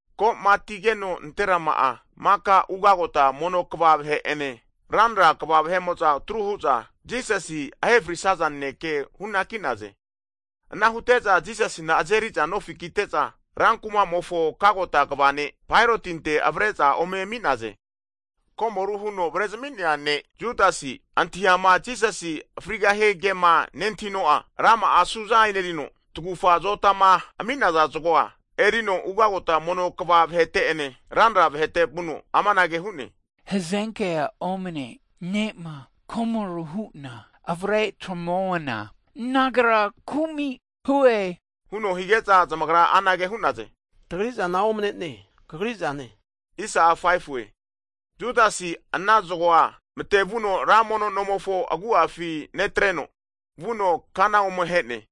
Ko'matigeno nanterama'a maka ugagota mono kva vahe'ene, ranra kva vahe'mo'za atru huza Jisasi ahefrisnaza naneke hunaki'naze. Ana hute'za Jisasina azeri'za nofi kite'za, rankumamofo kagota kva ne' (Gavana) Paeroti avare'za omemi'naze. Komoru huno avare zami'nea ne' Judasi'a antahiama Jisasi frigahie kema nentahino'a, rama'a asuza e'nerino, tagufa azotama ami'naza zgo'a erino ugagota mono kava vahete'ene ranra vahete vuno, amanage hu'ne, hazenke'a omane ne'ma komoru hu'na avare tamuana, nagra kumi hue huno hige'za zamagra anage hu'naze, tagri zana omane'neanki kagri'zane hu'naze. Judasi ana zgo'a mate'vuno ra mono nomofo agu'afi netreno, vuno kana ome he'ne.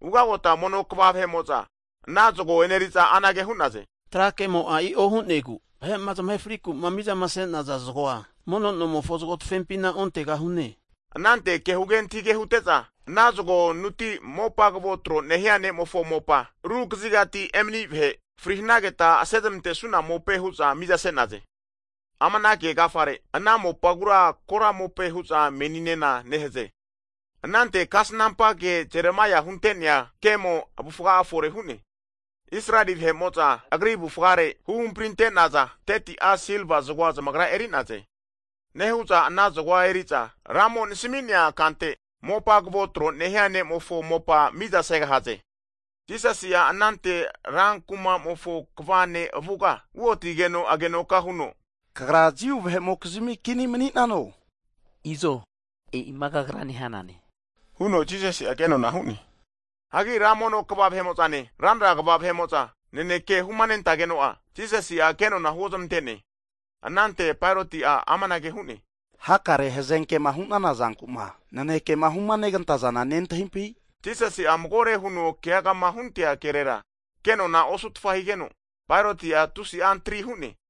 Ugagota mono kva vahe'mo'za ana zgo eneriza anage hu'naze, trakemo'a i'o hu'negu vahe'ma zamahe frikuma mizama ase'naza zgo'a mono nomofo zgo tafempina ontegahu'ne. Anante kehuge antahige hute'za, ana zgonuti mopa kvo tro nehia ne'mofo mopa, ru kazigati emani vahe fri hanageta asezamantesuna mope hu'za mizase'naze. Amana kegafare, ana mopagura kora mope hu'za meninena nehaze. Anante kasnampa ke Jeremaia hunte'nea kemo avufga'a fore hu'ne. Israeli vahe'mo'za agri avufgare huhamprinte'naza 30ti'a silva zgoa zmagra eri'naze, nehu'za ana zgoa eri'za, Ramo nasmi'nea kante mopa kvo tro' nehia ne'mofo mopa miza segahaze. Jisasi'a anante ra kumamofo kva (Gavana) ne' avuga uotigeno agenoka huno, Kagra Jiu vahemokizmi Kini mani'nano? Izo e'ima kagra nehanane, huno Jisasi ke'nona hu'ne. Hagi ra mono kva vahe'mo'zane, ranra kva vahe'mo'za naneke humanentageno'a Jisasi'a kenona huozmante'ne. Anante Paeroti'a amanage hu'ne, hakare hazenkema hu'nana zanku'ma naneke'ma huma negantazana nentahimpi? Jisasi'a magore huno keagama huntea kerera, ke nona'a osutfa higeno, Paeroti'a tusi'a antari hu'ne.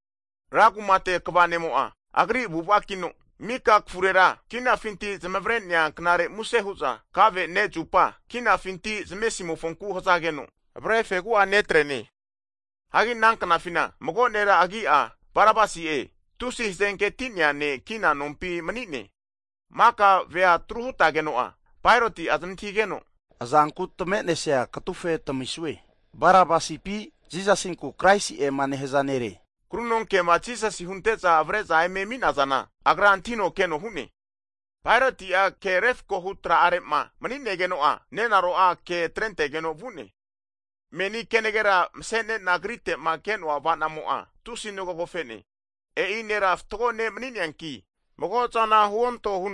Ra kumate kva ne'mo'a agri'a avu'avakino mika kafurera kinafinti zamavre'nea knare muse hu'za kave ne zupa (pasova) kinafinti zamesimofonku hazageno avare fegu'a netreane. Hagi ana knafina mago nera agi'a Barabasi'e tusi hazenketi'nea ne' kina nompi mani'ne. Maka veama atru hutageno'a, Paeroti'a zamantahigeno, azanku tamenesi'a katufe tamisue? Barabasipi, Jisasinku Kraisi'ema nehaza nere? Krunonkema Jisasi hunte'za avare'za eme ami'nazana agra antahinokeno hu'ne. Paeroti'a ke refakohu tra'are'ma mani'negeno'a, nenaro'a ke atregeno vu'ne. Meni kenagera mse'ne'na Agrite'ma ke'noa avanamo'a tusi ngogofe'ne. E'i Nera fatgo ne' mani'neanki, mago zana huonto.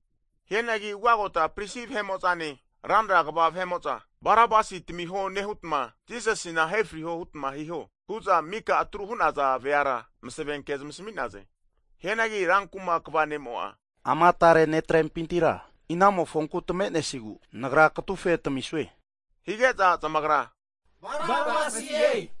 Hianagi ra mono kva vahe'mo'zane, ranra kva vahe'mo'za, Barabasi tamiho nehutma Jisasina ahefrio hutma hiho, hu'za mika atru hunaza veara masave ke zmasami'naze. Hianagi rankuma kva ne'mo'a, ama tare netrempitira inamofonku tamenesigu nagra katufe tamisue? Higeza zamagra Barabasie hu'naze.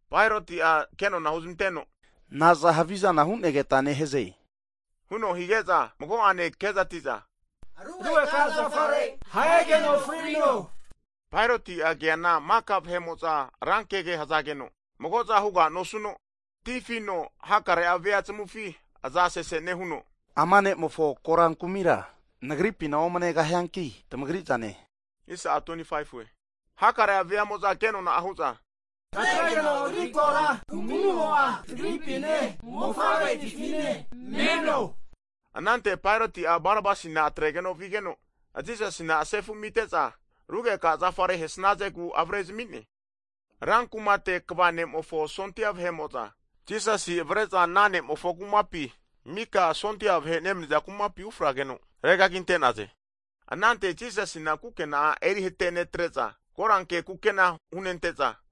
Paeroti'a kenona huzmanteno, Naza havizana hu'negeta neheze? huno hige'za, mago'ene kezati'za, Rugeka'zafare ahegeno frino. Paeroti'a keana maka vea'moza ra kege hazageno, mago'za huga nosuno tifino hakare vea zamufi aza sese nehuno, ama ne'mofo kora kumira nagripina omanegahianki, tmagri zane hu'ne. Hakare veamo'za ke nona'a hu'za, atregeno agri kora kumimo'a, tagripine mofavreti'fine meno, hu'naze. Anante Paeroti'a Barabasina atregeno vigeno, Jisasina sefu amite'za rugeka zafare hesnazegu avare'zmine. Rankumate kva ne'mofo sondia vahe'mo'za Jisasi avare'za ana nemofo kumapi mika sondia vahe nemniza kumate ufrageno regaginte'naze. Anante Jisasina kukena'a eri'hate netre'za koranke kukena hunente'za,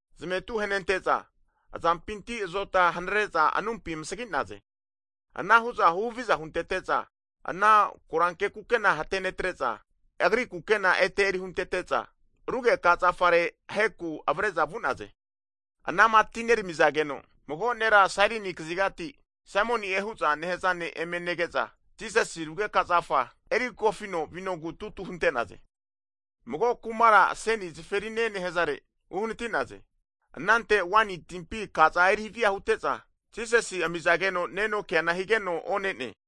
Zametu ahenente'za azampinti azota hanare'za anumpi amasgi'naze. Ana hu'za huhaviza huntete'za, ana koranke kukena hatenetre'za, agri kukena ete erihuntete'za, rugeka zafare aheza hantinaku avare'za vu'naze. Anama atinerami'zageno mago nera Sairini kazigati Saimoni'e hu'za nehaza ne' eme nege'za, Jisasi rugeka zafa eri kofino vinogu tutu hunte'naze. Mago kumara aseni zaferine nehazare (Golgota) uhanatinaze. Anante waini timpi akaza erihava hute'za, Jisasi amizageno neno keana higeno, one'ne.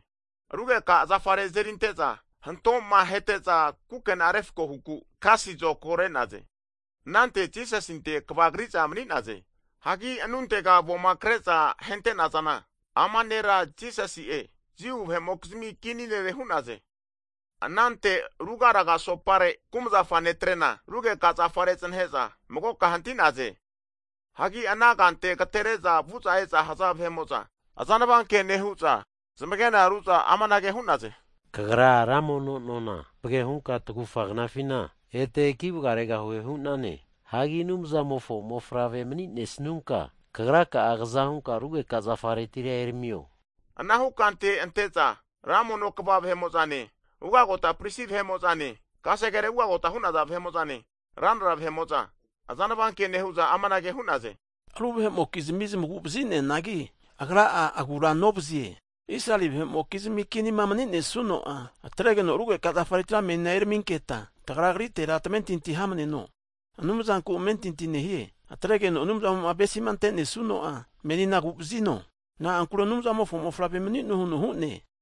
Rugeka zafare azerinte'za hanto'ma ahete'za kukena refako huku kasi zokago (tais) re'naze. Anante Jisasinte kvagri'za mani'naze. Hagi anuntega avoma kre'za ahentenazana, ama nera Jisasi'e. Jiu vahe'mokizmi kini nere hu'naze. Anante ruga raga asopare kumzafa netrena rugeka zafare znahe'za magoka hanti'naze. Hagi ana kante agatere'za vu'za e'za haza vahe'mo'za, azanva ke nehu'za zmagena ru'za, amanage hu'naze, Kagra ra mono nona tapage hunka tagufa knafina ete kivga'regahue hu'nane, hagi Anumzamofo Mofavre mani'nesnunka kagraka'a kza hunka rugeka zafaretira eramio. Anahu kante anteza ugagota prisi vahe'mozane, kasegere ugagota hunaza vahe'mozane, ranra vahe'moza azanva ke nehu'za amanage hu'naze. Ru vahe'mokizmi zamagu vazineanagi Agra'a agura novazie. Israeli vahe'mokizmi Kinima maninesuno'a! Atregeno rugeka zafaretira menina eraminketa, tagra Agrite tamentinti hamaneno. Anumzanku amentinti nehie. Atregeno Anumzamo avesima antesuno'a menina aguvazino, na'ankure Anumzamofo Mofavre mani'noe huno hu'ne.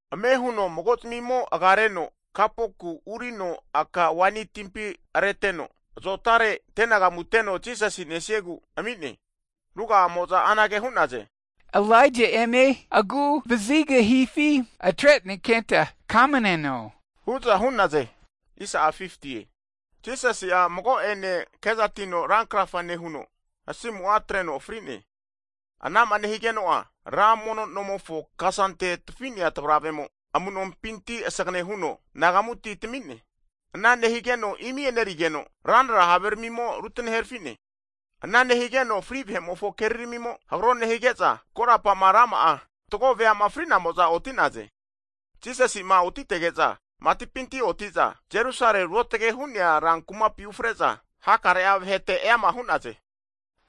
Ame huno mago'zimimo agareno kapuku (Spans) urino aka waini timpi areteno zotare antenagamu teno Jisasi nesiegu ami'ne. Ruga'amo'za anage hu'naze. Ilaija eme agu vazigahifi atre'nenketa kamaneno, hu'za hu'naze. Jisasi mago'ene kezatino ra krafa nehuno, asimu'a atreno fri'ne. Anama nehigeno'a, ra mono nomofo kasante tfi'nea tavravemo amu'nompinti sgane huno nagamuti tami'ne. Ana nehigeno imi enerigeno, ranra haveramimo rutane herafine. Ana nehigeno fri vahe'mofo keriramimo, hagro nehige'za korapa'ma rama'a fatgo veama fri'namo'za oti'naze. Jisasima otitege'za, matipinti otite'za Jerusale ruotage hu'nea rankumapi ufre'za hakare vahete eama hu'naze.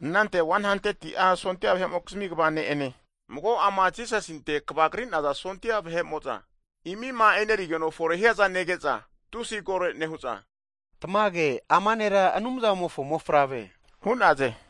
Anante 100ti'a sondia vahe'mokizmi kva ne'ene, mago'ama Jisasinte kvagri'naza sondia vahe'moza imima enerigeno fore hiaza nege'za tusi kore nehu'za, Tamage ama Nera Anumzamofo Mofavre! hu'naze.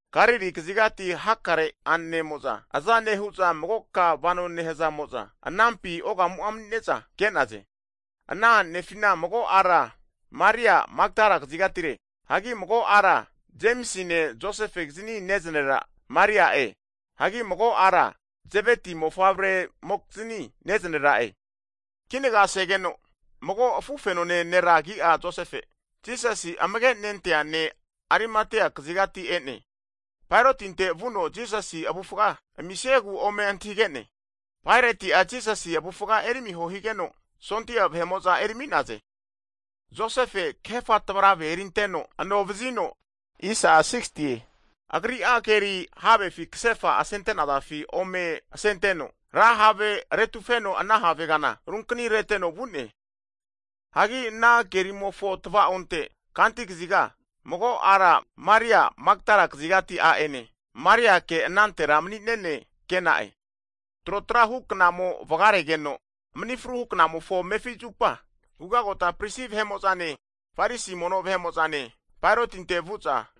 Galili kazigati hakare a'nenemo'za, aza nehu'za magoka vano nehazamo'za anampi ogamu'a mani'ne'za ke'naze. Ana a'nefina, mago a'ra Maria'e Makdala kazigatire. Hagi mago a'ra Jemisine Josefegizni neznerera Maria'e. Hagi mago a'ra Zeveti mofavre'mokizini neznera'e. Kinaga segeno mago afufenone nera agi'a Josefe, Jisasi amage nentea ne' Arimatia kazigati e'ne. Paerotinte vuno Jisasi avufga amisiegu ome antahige'ne. Paerati'a Jisasi avufga eriamiho higeno, sondia vahe'mo'za eri ami'naze. Josefe kahefa tavaravefi erinteno ano vazino, agri'a keri havefi kasefa asente'nazafi ome asenteno, ra have retufeno ana have kana runkni reteno vu'ne. Hagi ana kerimofo tva'onte kanti kaziga, mago ara Maria Makdala kazigati a'ene, Mariake anantera mani'nene ke'na'e. Trotra huknamo vagaregeno mni fruhu knamofo amefi zupa ra mono kva vahe'mozane, Farisi mono vahe mo'zane Paerotinte vu'za,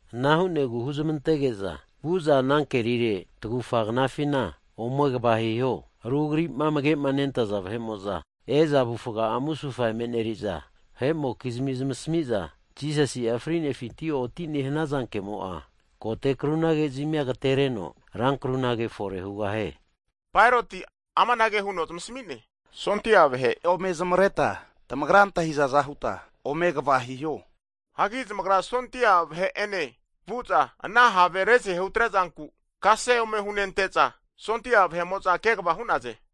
Ana hu'negu huzmantege'za, vu'za ana kerire tagufa knafina ome kva hiho. Ru agri'ma amage'ma nentaza disaipol vahe'moza e'za avufga'a musufa emeneriza, vahe'mokzimi zmasamiza Jisasi'a frinefinti otine hanaza kemo'a, kote krunage zmia agatereno, rankrunage fore hugahie. Paeroti amanage huno zamasmi'ne, sondia vahe ome zmavreta tamagra ma antahizaza huta ome kva hiho. Hagi zmagra sondia vahe'ene vu'za, ana have rezahe hutre'zanku kase ome hunente'za sondia vahe'moza kegva hu'naze.